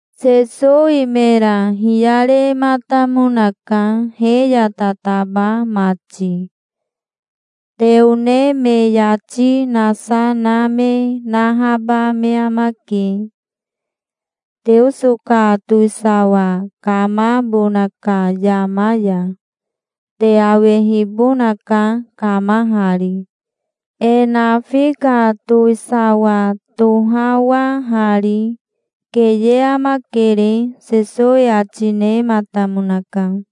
Sesowi mera hiyarematamonaka, he ya tataba mati. "Te one me yati nasa na me nahaba me amake, Teoso ka towisawa kamabona ka yama ya. Te awehibonaka kamahari, e nafi ka towisawa tohawahari. Keye amakere", Sesowi ati nematamonaka.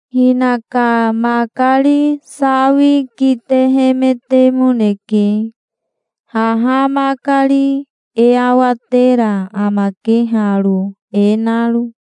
Hinaka makari sawi kitehemetemoneke. Haha makari e awatera amake haro, e naro.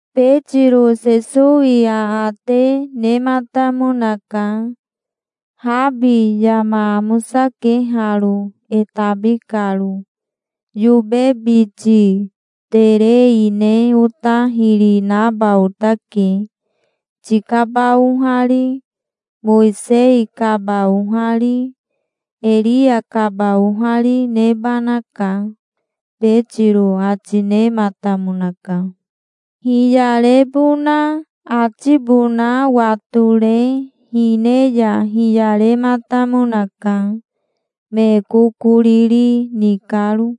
Betiro Sesowi aate nematamonaka. "Habi yama amosake haro, e tabi karo. Yobe biti terei ne ota hiri naba otake. Tikaba ohari, Mowisei kaba ohari, Eria kaba ohari nebanaka", Betiro ati nematamonaka. Hiyarebona atibona watore hine ya hiyarematamonaka, me kokoriri ni karo.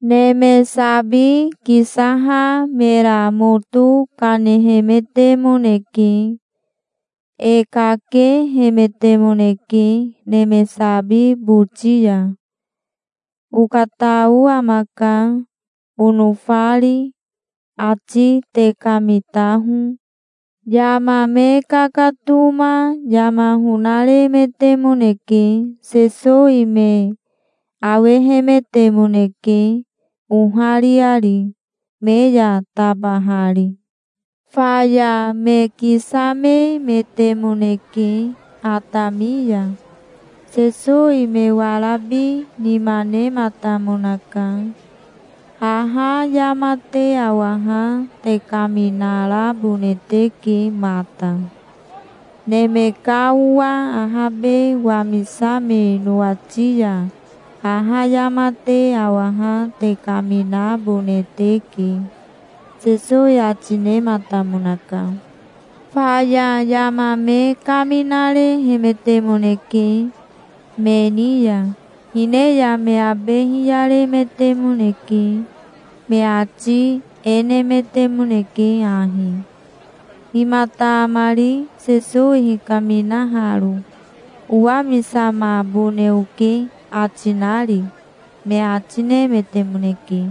Neme sabi kisaha mera moto kanehemetemoneke. E kakehemetemoneke neme sabi boti ya. "Okatao amaka, onofari. Ati te kamitaho". Yama me kakatoma yama honaremetemoneke. Sesowi me awehemetemoneke, ohariari, me ya tabahari. Faya me kisamemetemoneke, atami ya. Sesowi me warabi nima nematamonaka. "Haha yama te awaha te kaminarabone teke mata. Neme ka Owa ahabe wamisame nowati ya haha yama te awaha te kaminabone teke", Sesowi ati nematamonaka. Faya yama me kaminarehemetemoneke me ni ya. Hine ya me abe hiyaremetemoneke. Me ati e nemetemoneke ahi: "Himata amari, Sesowi hikaminaharo, 'Owamisamabone oke', ati nari?" me ati nemetemoneke.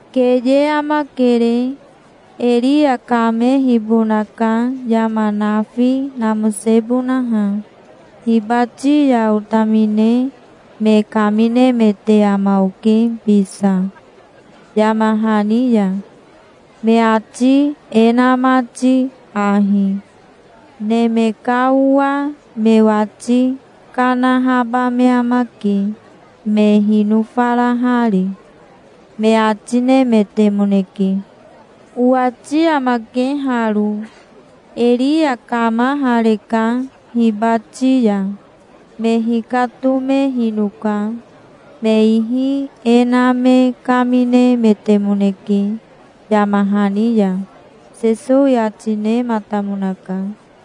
"Keye amakere. Eria kamehibonaka yama nafi namosebonaha. Hibati ya otamine me kaminemete ama oke bisa, yama hani ya, me ati e na mati ahi: 'Neme ka Owa me wati kanahaba me amake, me hinofarahari', me ati nemetemoneke. Owati amake haro: Eria kamahareka hibati ya. Me hikatomehinoka. Me ihi e na me kaminemetemoneke, yama hani ya," Sesowi ati nematamonaka.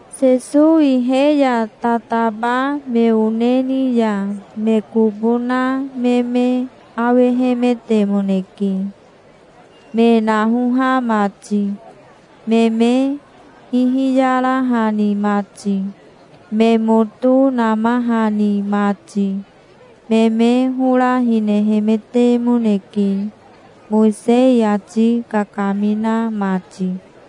Sesowi he ya tataba me one ni ya me kobo na me me awehemetemoneke, me nahoha mati, me me hihiyarahani mati, me moto namahani mati. Me me hora hinehemetemoneke, Mowisei ati kakamina mati.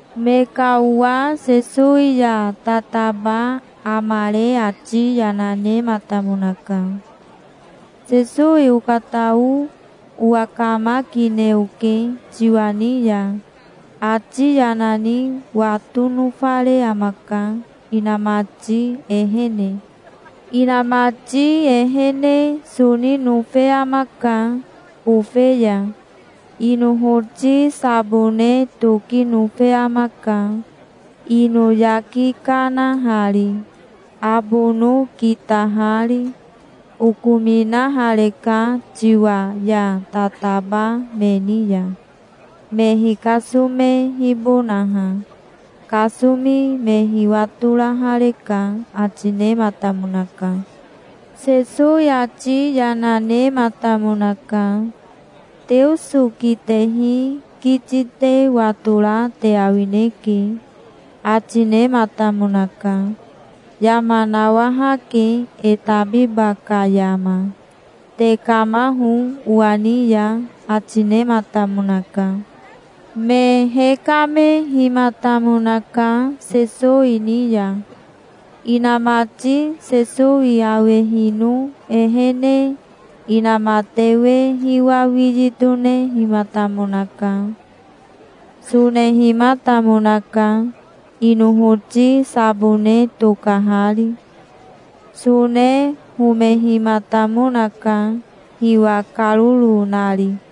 Me ka owa Sesowi ya tataba amare ati yana nematamonaka. "Sesowi okatao owakamakine oke, tiwa ni ya. Ati yana ni wato nofare amaka, inamati ehene. Inamati ehene soni nofe amaka, bofe ya. Inohoti sabone toki nofe amaka, ino yaki kanahari, abono kitahari. Okominahareka tiwa ya tataba me ni ya, me hikasomehibonaha. Kasomi me hiwatorahareka", ati nematamonaka. Sesowi ati yana nematamonaka. "Teoso kitehi kiti te watora te awineke", ati nematamonaka. "Yama nawahake e tabiba ka yama. Tekamaho owa ni ya", ati nematamonaka. Me hekamehimatamonaka, Sesowi ni ya. Inamati Sesowi awehino ehene inamatewe hiwa wiyi tonehimatamonaka. Sonehimatamonaka, inohoti sabone tokahari. Sone homehimatamonaka, hiwa karoro nari.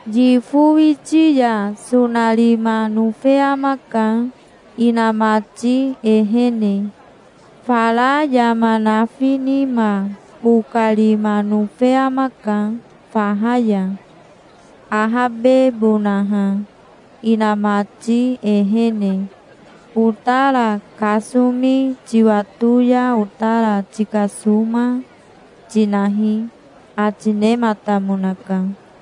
Yifo witi ya sonarima nofe amaka, inamati ehene. Fara yama nafi nima bokarima nofe amaka, faha ya, ahabebonaha, inamati ehene. Otara kasomi tiwato ya otara tikasoma, tinahi", ati nematamonaka.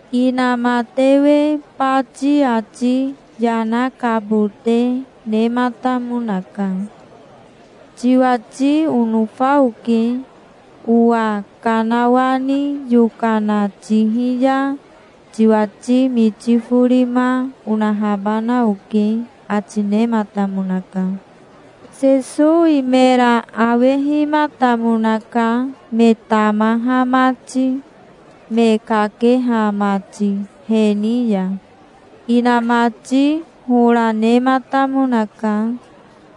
Inamatewe bati ati yana kabote nematamonaka. "Tiwati onofa oke. Owa kanawani yokana tihi ya tiwati miti forima onahabana oke", ati nematamonaka. Sesowi mera awehimatamonaka, me tamaha mati, me kakeha mati, he ni ya. Inamati hora nematamonaka.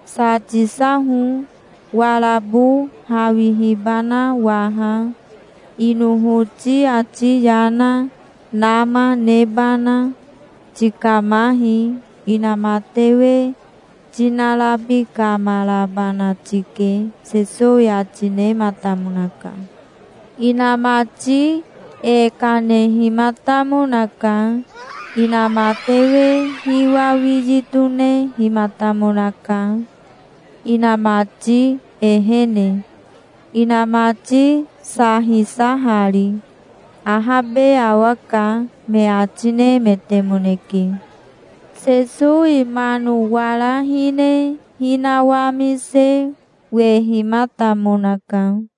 "Sa tisaho, warabo hawihibana waha, inohoti ati yana nama nebana. Tikamahi. Inamatewe tinarabikamarabana tike", Sesowi ati nematamonaka. Inamati e kanehimatamonaka. Inamatewe hiwa wiyi tonehimatamonaka, inamati ehene, inamati sa hisahari. "Ahabe awaka", me ati nemetemoneke. Sesowi mano wara hine hinawamise wehimatamonaka.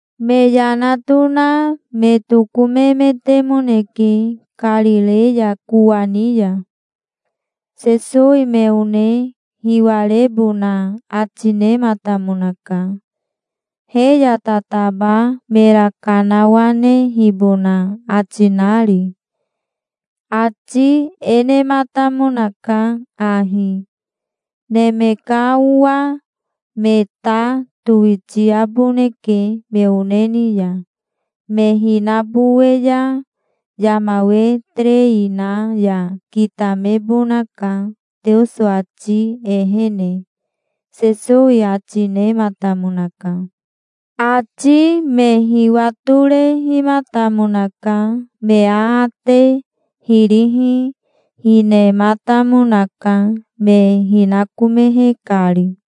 Me yana tona me tokomemetemoneke Karireya kowani ya. Sesowi me one hiwarebona ati nematamonaka, he ya tataba mera kanawanehibona ati nari. Ati e nematamonaka ahi: "Neme ka Owa me ta towitiaboneke me one ni ya. Me hinabowe ya yama we terei na ya kitamebonaka Teoso ati ehene", Sesowi ati nematamonaka. Ati me hiwatorehimatamonaka. Me aate hirihi hinematamonaka, me hinakomehe kari.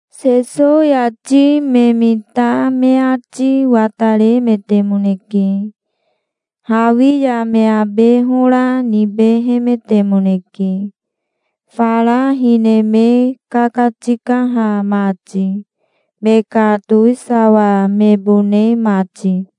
Sesowi ati me mita me ati wataremetemoneke. Hawi ya me abe hora nibehemetemoneke, fara hine me kakatikaha mati, me ka towisawa mebone mati.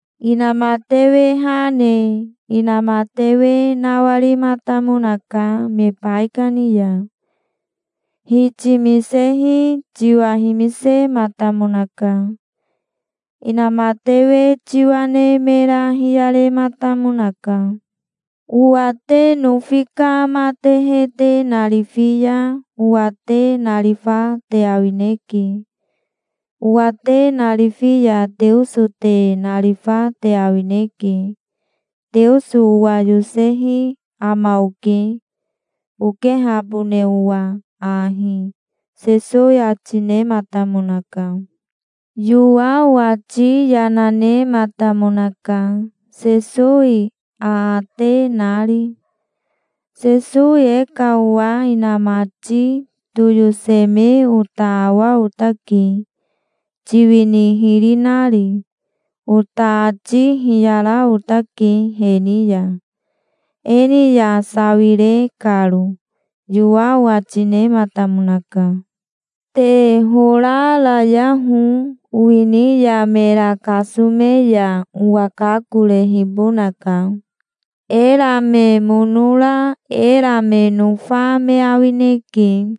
Inamatewe ha ne inamatewe nawarimatamonaka me baikani ya. Hitimisehi tiwa himisematamonaka. Inamatewe tiwa ne mera hiyarematamonaka. "Owa te nofi ka matehe te narifi ya owa te narifa te awineke. Owa te narifi ya Teoso te narifa te awineke. Teoso owa yosehi ama oke, okehabone owa ahi", Sesowi ati nematamonaka. Yowao ati yana nematamonaka, Sesowi aate nari. "Sesowi e ka owa inamati toyoseme ota awa otake, tiwini hiri nari. Ota ati hiyara otake he ni ya, e ni ya sawire karo", Yowao ati nematamonaka. "Te hora rayaho. Owini ya mera kasome ya owa kakorehibonaka. Era me mono ra era me nofa me awineke.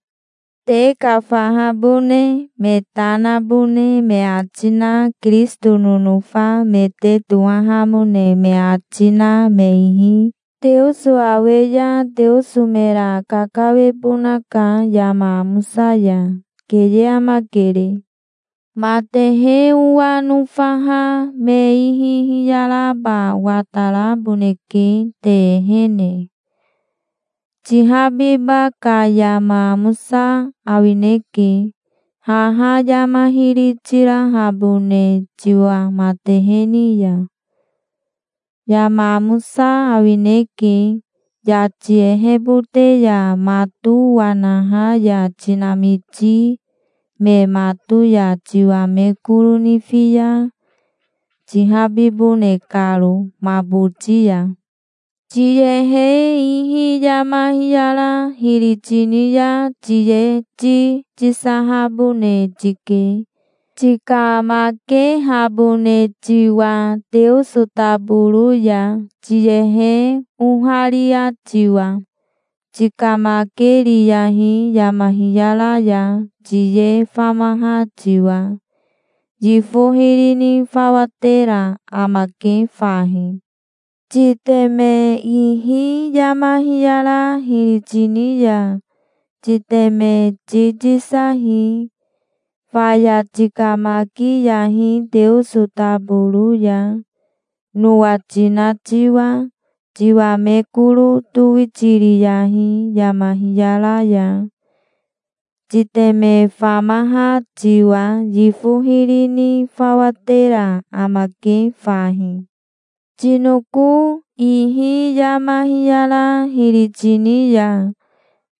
Te ka fahabone me ta nabone me ati na Kirisito nonofa me te tohahamone me ati na me ihi Teoso awe ya Teoso mera kakawebonaka yama amosa ya. Keye amakere". "Matehe owa nofaha me ihi hiyaraba wataraboneke te ehene. Tihabiba ka yama amosa awineke, haha yama hiri tirahabone tiwa matehe ni ya. Yama amosa awineke, yati ehebote ya mato wanaha ya tinamiti me mato ya tiwa me koro nifi ya, tihabibone karo ma boti ya". "Tiyehe ihi yama hiyara hiri tini ya tiye ti tisahabone tike, tikamakehabone tiwa Teoso taboro ya, tiyehe oharia tiwa. Tikamakeriyahi yama hiyara ya, tiye famaha tiwa. Yifo hiri ni fawa tera amake fahi. Titeme ihi yama hiyara hiri tini ya titeme ti tisahi. Faya tikamakiyahi Teoso taboro ya, nowa tina tiwa. Tiwa me koro towitiriyahi yama hiyara ya, titeme famaha tiwa. Yifo hiri ni fawa tera amake fahi. Tinoko ihi yama hiyara hiri tini ya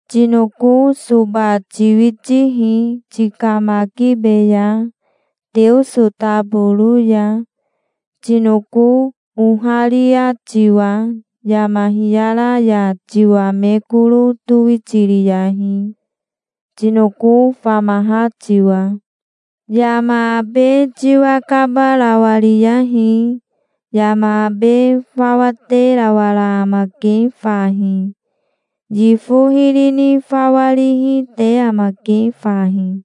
tinoko soba tiwitihi. Tikamakibeya, Teoso taboro ya, tinoko oharia tiwa. Yama hiyara ya tiwa me koro towitiriyahi, tinoko famaha tiwa. Yama abe tiwa kabarawariyahi. Yama abe fawa terawara amake fahi. Yifo hiri ni fawa rihi te amake fahi".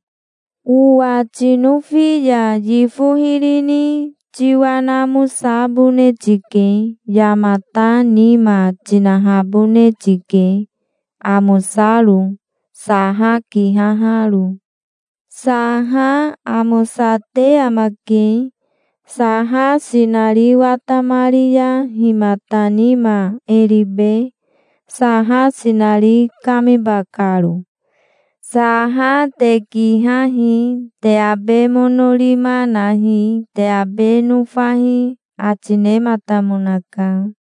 "Owa tinofi ya yifo hiri ni tiwa namosabone tike. Yamata nima tinahabone tike, amosaro, saha kihaharo. Saha amosate amake. Saha sinari watamari ya himata nima e ribe, saha sinari kamiba karo? Saha te kihahi. Te abe mono rima nahi. Te abe nofahi", ati nematamonaka.